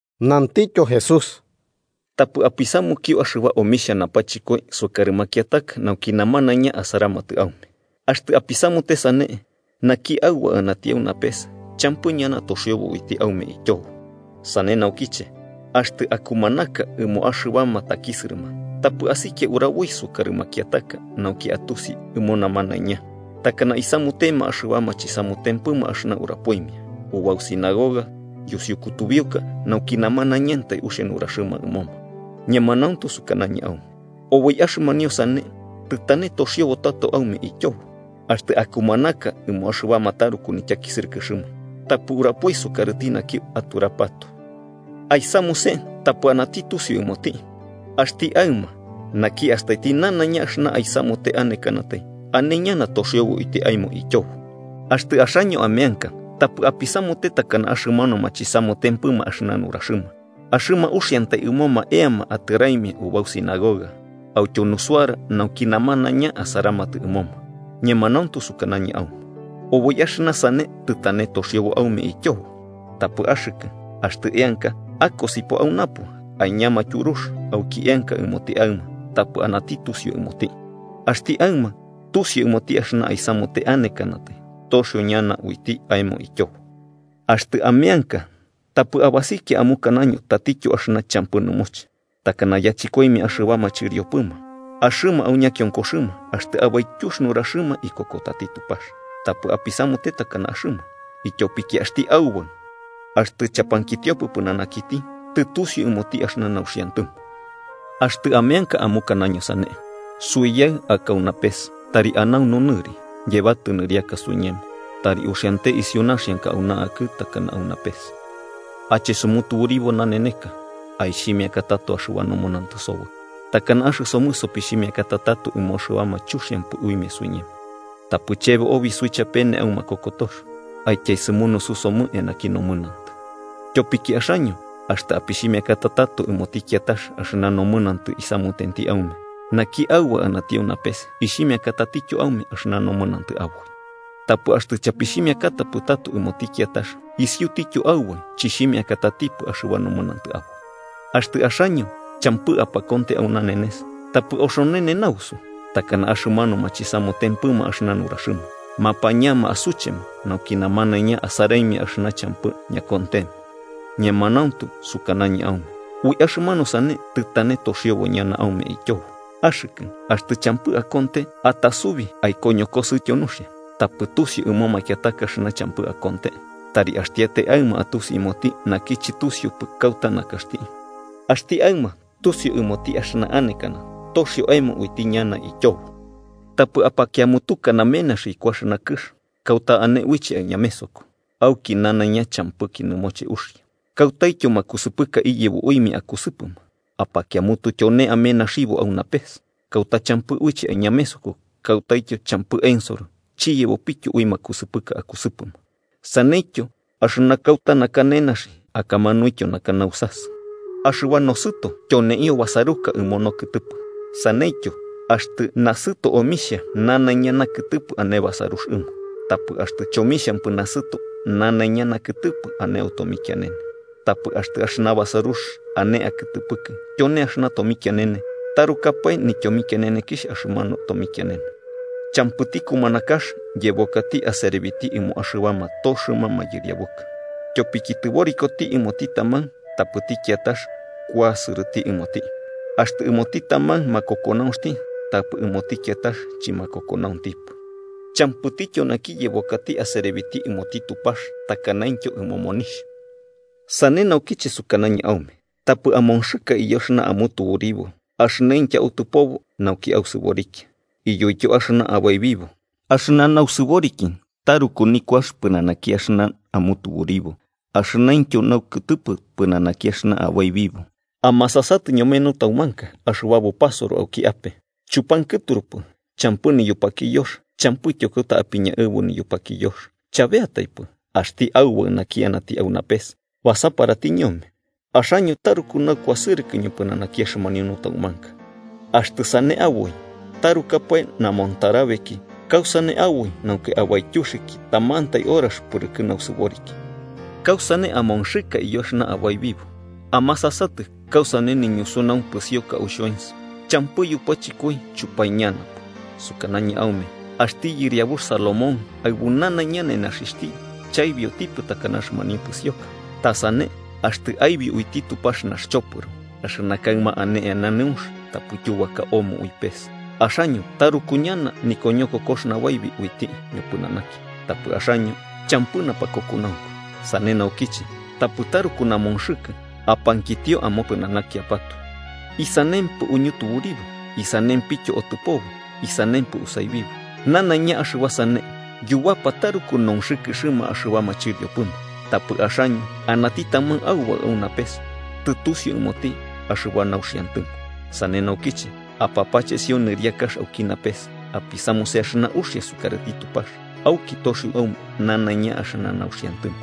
Nantityo Jesús: “Tapɨ apisamukio axɨba omixhia napachɨkoi sukarɨ makiataka nauki namanaiña asaramatɨ aume. Axtɨ apisamute sane, naki Aubaɨ anati au napes champɨ ñana toxiobo uiti aume ityobo. “Sane naukiche, axtɨ akumanaka ɨmo axɨbama takisɨrɨma, tapɨ asikia uraboi sukarɨ makiataka nauki atusi ɨmo namanaiña, takana isamutema axɨbama chisamutempɨma axɨna urapoimia ubau sinagogas yusiu kutubiuka nauki namanaiñantai uxia nuraxɨma ɨmoma. Ñemanauntu sukanañɨ aume oboi axɨmanio sane tɨtane toxiobo tato aume ityobo. Axtɨ akumanaka ɨmo axɨbama taruku nityakisɨrɨkɨxɨma, tapɨ urapoi sukarɨti naki aturapatoe. Aisamuse tapɨ anati tusiu ɨmoti. Axti Aɨma, naki astaiti nanaiña axɨna aisamute anekanatai, ane ñana toxiobo uiti aemo ityobo. “Axtɨ axaño ameanka, tapɨ apisamute takana axɨmanuma chisamutempɨ axɨna nuraxɨma, axɨma uxiantai ɨmoma eama atɨraimia ubau sinagoga autyo nusuara nauki namanaiña asaramatɨ ɨmoma. Ñemanauntu sukanañɨ aume oboi axɨna sane tɨtane toxiobo aume ityobo. Tapɨ axɨkɨ, axtɨ eanka, akosipo au napo, aiñama tyurux auki eanka ɨmoti Aɨma tapɨ anati tusiu ɨmoti. Axti Aɨma, tusiu ɨmoti axɨna aisamute anekanatai, toxio ñana uiti aemo ityobo. “Axtɨ ameanka tapɨ abasikia amukanaño tatityo axɨna champɨ nɨmoche, takana yachɨkoimia axɨbama chɨriopɨma, axɨma au ñakionkoxɨma axtɨ abaityux nuraxɨma ikokotati Tupax. Tapɨ apisamute takana axɨma, ityopiki axti Aubaɨ axtɨ chapankitiokipɨ pɨnanakiti, tɨtusiu ɨmoti axɨna nauxiantɨmo. Axtɨ ameanka amukanaño sane: ‘Suiyaɨ aka au napes, tari anaunu nɨri. Yebatɨ nɨriaka suiñemo. Tari uxiante isiu naxianka auna akɨ, takana au napes. Ache sumutuburibo naneneka. Aixhimiaka tato axɨba nomɨnantɨ soboi, takana axɨsomɨ sopixhimiakata tato ɨmo axɨbama chuxiampɨ uimia suiñemo. Tapɨ chebo obi suichapene au makokotox, aityaesɨmunusu somɨ eanaki nomɨnantɨ.’ “Tyopiki axaño axtɨ apixhimiakata tato ɨmoti kiatax axɨna nomɨnantɨ isamutenti aume, naki Aubaɨ anati au napes ixhimiakatatityo aume axɨna nomɨnantɨ aboi. Tapɨ axtɨ chapixhimiakatapɨ tato ɨmoti kiatax, isiutityo Aubaɨ chixhimiakatatipɨ axɨba nomɨnantɨ aboi. “Axtɨ axaño champɨ apakonte au nanenes, tapɨ oxonene nausu, takana axɨmanuma chisamutempɨma axɨna nuraxɨma, mapañama asuchema nauki namanaiña asaraimia axɨna champɨ ñakontema. Ñemanauntu sukanañɨ aume ui axɨmanu sane tɨtane toxiobo ñana aume ityobo. Axɨkɨ, axtɨ champɨ akonte, atasubi aikoñokosɨtyo nuxia, tapɨ tusiu ɨmo makiataka axɨna champɨ akonte. Tari axtiatai Aɨma atusi ɨmoti, naki chɨtusiupɨ kauta nakaxti, axti Aɨma tusiu ɨmoti axɨna anekana toxio aemo uiti ñana ityobo. “Tapɨ apakiamutuka namenaxi iku axɨna kɨx, kauta ane uiche aiñamesoko auki nanaiña champɨki nɨmoche uxia, kautaityo makusɨpɨka iyebo uimia akusɨpɨma. Apakiamutu tyone amenaxibo au napes, kauta champɨ uiche aiñamesoko kautaityo champɨ ensoro chiyebopityo ui makusɨpɨka akusɨpɨma. Saneityo axɨna kauta naka nenaxi, akamanuintyo naka nausasɨ. “Axɨba nosɨto tyoneio basaruka ɨmo nokɨtɨpɨ. Saneityo, axtɨ nasɨto omixhia, nanaiña nakɨtɨpɨ ane basarux ɨmo. Tapɨ axtɨ chomixhampɨ nasɨto, nanaiña nakɨtɨpɨ ane au tomikianene. Tapɨ axtɨ axɨna basarux ane akɨtɨpɨkɨ tyone axɨna tomikianene, ¡tarukapae nityomikianenekixh axɨmanu tomikianene! “Champɨti kumanakax yebokati aserebiti ɨmo axɨbama toxɨma mayɨriabuka. Tyopiki tɨborikoti ɨmoti taman tapɨti kiatax kuasɨrɨti ɨmoti, axtɨ ɨmoti taman makokonaunxti tapɨ ɨmoti kiatax chɨmakokonauntipɨ. Champɨtityo naki yebokati aserebiti ɨmoti Tupax takanaintyo ɨmo monixh.” “Sane naukiche, sukanañɨ aume: Tapɨ amonxɨka iyo axɨna amutuburibo axɨnaintyo autɨpobo nauki ausɨborikia, iyoityo axɨna abaibibo. Axɨna nausɨboriki taruku nikuax pɨnanaki axɨna amutuburibo, axɨnaintyo naukɨtɨpɨ pɨnanaki axɨna abaibibo. Amasasatɨ ñome nutaumanka axɨba bupasoro auki ape: chupankɨturupɨ champɨ niyupakiyox, champɨityo kauta apiñaɨbu niyupakiyox. Chabeataipɨ, axti Aubaɨ naki anati au napes, basaparati ñome. ¡Axaño taruku naukuasɨrɨkɨ ñopɨnanaki axɨmanio nutaumanka! Axtɨ sane aboi, tarukapae namontarabeki, ¿kausane aboi nauki abaityuxɨki tamantai horax pɨrɨkɨ nosɨboriki? “¿Kausane amonxɨkɨ iyo axɨna abaibibo? Amasasatɨ kausane niñusunaunx pɨsioka au xhoens: champɨ yupachɨkoi chupaiñanapɨ. Sukanañɨ aume, axti yɨriabux Salomón, aɨbu nanaiña nenaxixhti, chaibiotipɨ takana axɨmanio pɨsioka. Ta sane axtɨ aibio uiti Tupax naxchopɨro, axɨna kaɨma ane eana nɨunx tapɨ tyubaka omo ui pes, ¡axaño taruku ñana nikoñokokox nabaibi uiti ñopɨnanaki, tapɨ axaño champɨ napakokonaunku! Sane naukiche, tapɨ taruku namonxɨkɨ, apankitio amopɨnanakiapatoe: ‘¿Isanempɨ uñutuburibo?’ ‘¿Isanempityo otɨpobo?’ ‘¿Isanempɨ usaibibo?’ Nanaiña axɨba sane yubapa taruku nonxɨkɨxɨma axɨbama chɨriopɨma, tapɨ axaño anati taman Aubaɨ au napes tɨtusiu ɨmoti axɨba nauxiantɨmo. Sane naukiche, apapachesio nɨriakax auki napes apisamuse axɨna uxia sukarɨti Tupax, auki toxio aume nanaiña axɨna nauxiantɨmo.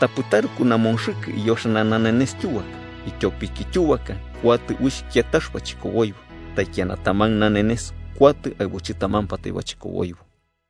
Tapɨ taruku namonxɨkɨ iyo axɨna nanenes tyubaka, ityopiki tyubaka kuatɨ uixh kiatax bachɨkoboibo. Taikiana taman nanenes kuatɨ aɨbu chɨtamampatai bachɨkoboibo.